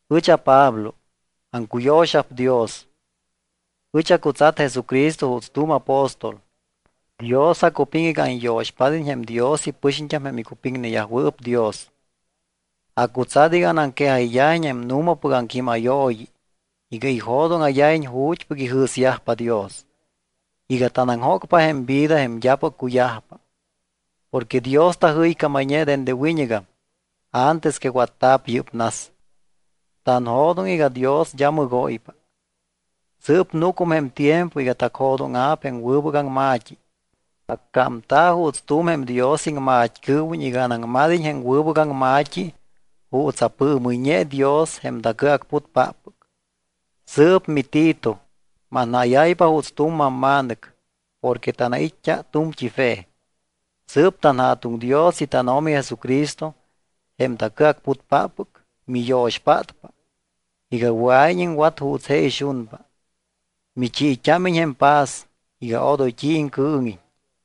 Ɨch aPablo, aŋcuyo̱xa̱p Dios. Ɨch acutsat Jesucristo juuts tu̱m apóstol. Dios acupiŋ iga anyo̱xpád́iñ jém Dios ipɨxiñt́am jém icupiŋneyajwɨɨp Dios. Acutsat iga anaŋquejayyajiñ jém nu̱mapɨc aŋquímayooyi iga ijo̱dóŋa̱yajiñ ju̱t́pɨc ijɨ̱syajpa Dios, iga tanaŋjócpa jém vida jém d́apɨc cuyajpa. Porque Dios tajɨycámayñe dende wiñɨgam, antes que watta̱p yɨ́p nas. Tanjo̱doŋ iga Dios d́a mɨgóypa. Sɨɨp núcum jém tiempo iga tacjo̱dóŋa̱p jém wɨbɨc aŋma̱t́i. Accámta̱ juuts tu̱m jém Dios iŋmat́cɨɨwiñ iga anaŋmad́iñ jém wɨbɨc aŋma̱t́i juuts apɨɨmɨyñe Dios jém tacɨacputpáppɨc. Sɨɨp miTito, manjáyáypa juuts tu̱m mamma̱nɨc porque tanait́t́a tu̱mt́i fe. Sɨɨp tanJa̱tuŋ Dios y tánO̱mi Jesucristo, jém tacɨacputpáppɨc, miyo̱xpátpa iga wɨa̱iñ iŋwat juuts je ixunpa, michiit́ámiñ jém paz iga odoy t́i iŋcɨɨŋiñ.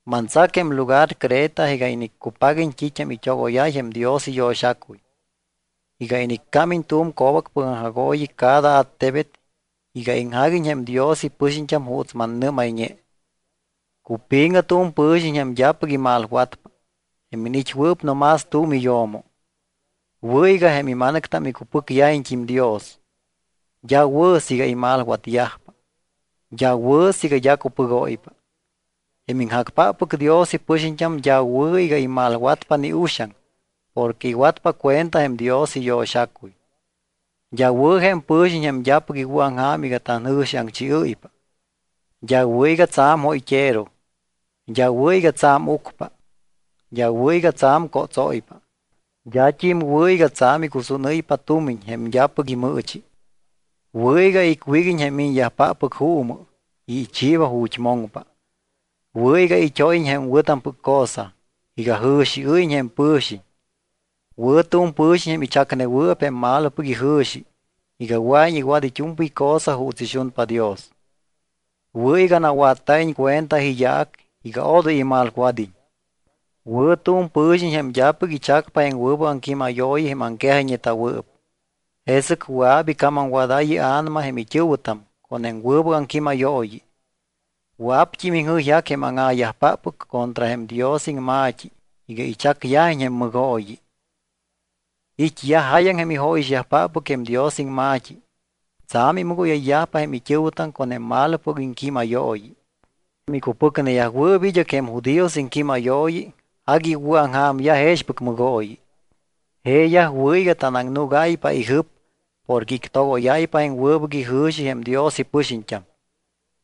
Mantsac jém lugar Creta iga iniccupaguiñ t́it́am it́ogóyáy jém Dios iyo̱xacuy, iga iniccámiñ tu̱m co̱bacpɨc aŋjagooyi cada attebet iga iŋjaguiñ jém Dios ipɨxiñt́am juuts mannɨ́mayñe. Cupi̱ŋɨ tu̱m pɨ̱xiñ jém d́apɨc imalwatpa, jém iniit́wɨɨp no más tu̱m iyo̱mo. Wɨ̱ iga jém ima̱nɨctam icupɨcyajpat́im Dios. D́a wɨ̱ siiga imalwatyajpa. D́a wɨ̱ siiga d́a cupɨgóypa. Jém iŋjacpáppɨc Dios ipɨxiñt́am, d́a wɨ̱ iga imalwatpa ni uxaŋ porque iwatpa cuenta jém Dios iyo̱xacuy. D́a wɨ̱ jém pɨ̱xiñ jém d́apɨc iwɨ̱aŋja̱m iga tanjɨ̱xiaŋchiɨ́ypa. D́a wɨ̱ iga tsa̱m jóyt́ero, d́a wɨ̱ iga tsa̱m ucpa. D́a wɨ̱ iga tsa̱m cótsóypa. D́at́im wɨ̱ iga tsa̱m icusúnɨ́ypa tumiñ jém d́apɨc imɨɨchi. Wɨ̱ iga icwíguiñ jém miñyajpáppɨc juumɨ y ichiiba ju̱t́ moŋpa. Wɨ̱ iga it́óyiñ jém wɨ̱tampɨc cosa, iga jɨ̱xiɨ́yiñ jém pɨ̱xiñ. Wɨ̱ tu̱m pɨ̱xiñ jém ichacnewɨɨp jém malopɨc ijɨ̱xi, iga wɨa̱iñ iwat it́u̱mpɨy cosa juuts ixunpa Dios. Wɨ̱ iga nawatta̱iñ cuenta iyaac iga odoy imalwad́iñ. Wɨ̱ tu̱m pɨ̱xiñ jém d́apɨc ichacpa jém wɨbɨc aŋquímayooyi jém aŋquejayñeta̱wɨɨp. Jesɨc wɨa̱p icamamwadáy ia̱nama jém it́ɨ̱wɨtam con jém wɨbɨc aŋquímayooyi. Wɨa̱pt́im iŋjɨyjac jém áŋa̱yajpáppɨc contra jém Dios iŋma̱t́i iga ichacyajiñ jém mɨgooyi. It́yaj jáyaŋ jém ijóyixyajpáppɨc jém Dios iŋma̱t́i. Tsa̱m imɨgóyayyajpa jém it́ɨ̱wɨtam con jém malopɨc iŋquímayooyi. Jém icupɨcneyajwɨɨp id́ɨc jém judíos iŋquímayooyi agui iwɨ̱aŋja̱myaj jexpɨc mɨgooyi. Jeeyaj wɨ̱ iga tananúgáypa ijɨp porque ictogoyáypa jém wɨbɨc ijɨ̱xi jém Dios ipɨxiñt́am.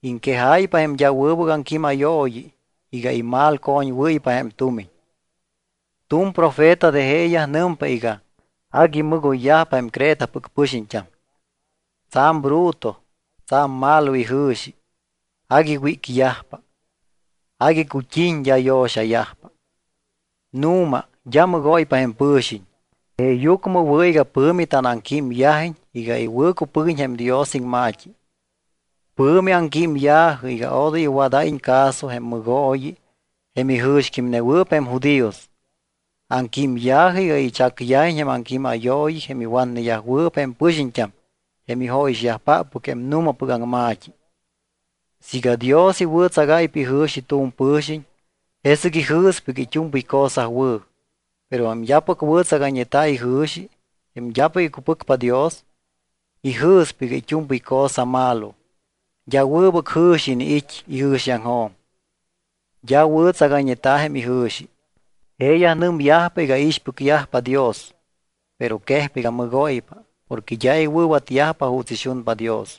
Iŋquejáypa jém d́a wɨbɨc aŋquímayooyi iga imalcoñwɨ́ypa jém tumiñ. Tu̱m profeta de jeeyaj nɨmpa iga: “Agui mɨgoyyajpa jém Cretapɨc pɨxiñt́am. Tsa̱m bruto, tsa̱m malo ijɨ̱xi. Agui wícyajpa. Agui cut́iñ, d́a yo̱xayajpa.” Nu̱ma, d́a mɨgóypa jém pɨ̱xiñ. Jeeyucmɨ wɨ̱ iga pɨ̱mi tanaŋquímyajiñ iga iwɨ̱cupɨguiñ jém Dios iŋma̱t́i. Pɨ̱mi aŋquímya̱jɨ iga odoy iwadayyajiñ caso jém mɨgooyi jém ijɨ̱xquímnewɨɨp jém judíos. Aŋquímya̱jɨ iga ichacyajiñ jém aŋquímayooyi jém iwatneyajwɨɨp jém pɨxiñt́am jém ijóyixyajpáppɨc jém nu̱mapɨc aŋma̱t́i. Siiga Dios iwɨ̱tsagáypa ijɨ̱xi tu̱m pɨ̱xiñ, jesɨc ijɨ̱spa iga it́u̱mpɨy cosa wɨ̱. Pero jém d́apɨc wɨ̱tsagayñeta̱ ijɨ̱xi, jém d́apɨc icupɨcpa Dios, ijɨ̱spa iga it́u̱mpɨy cosa malo. D́a wɨbɨc jɨ̱xi iniit́ ijɨ̱xiaŋjo̱m, d́a wɨ̱tsagayñeta̱ jém ijɨ̱xi. Jeeyaj nɨmyajpa iga iixpɨcyajpa Dios, pero quejpa iga mɨgóypa porque d́a iwɨ̱watyajpa juuts ixumpa Dios.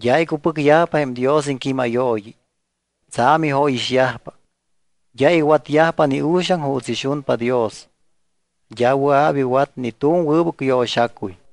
D́a icupɨcyajpa jém Dios iŋquímayooyi. Tsa̱m jóyixoyyajpa. D́a iwatyajpa ni uxaŋ juuts ixunpa Dios. D́a wɨa̱p iwat ni tu̱m wɨbɨc yo̱xacuy.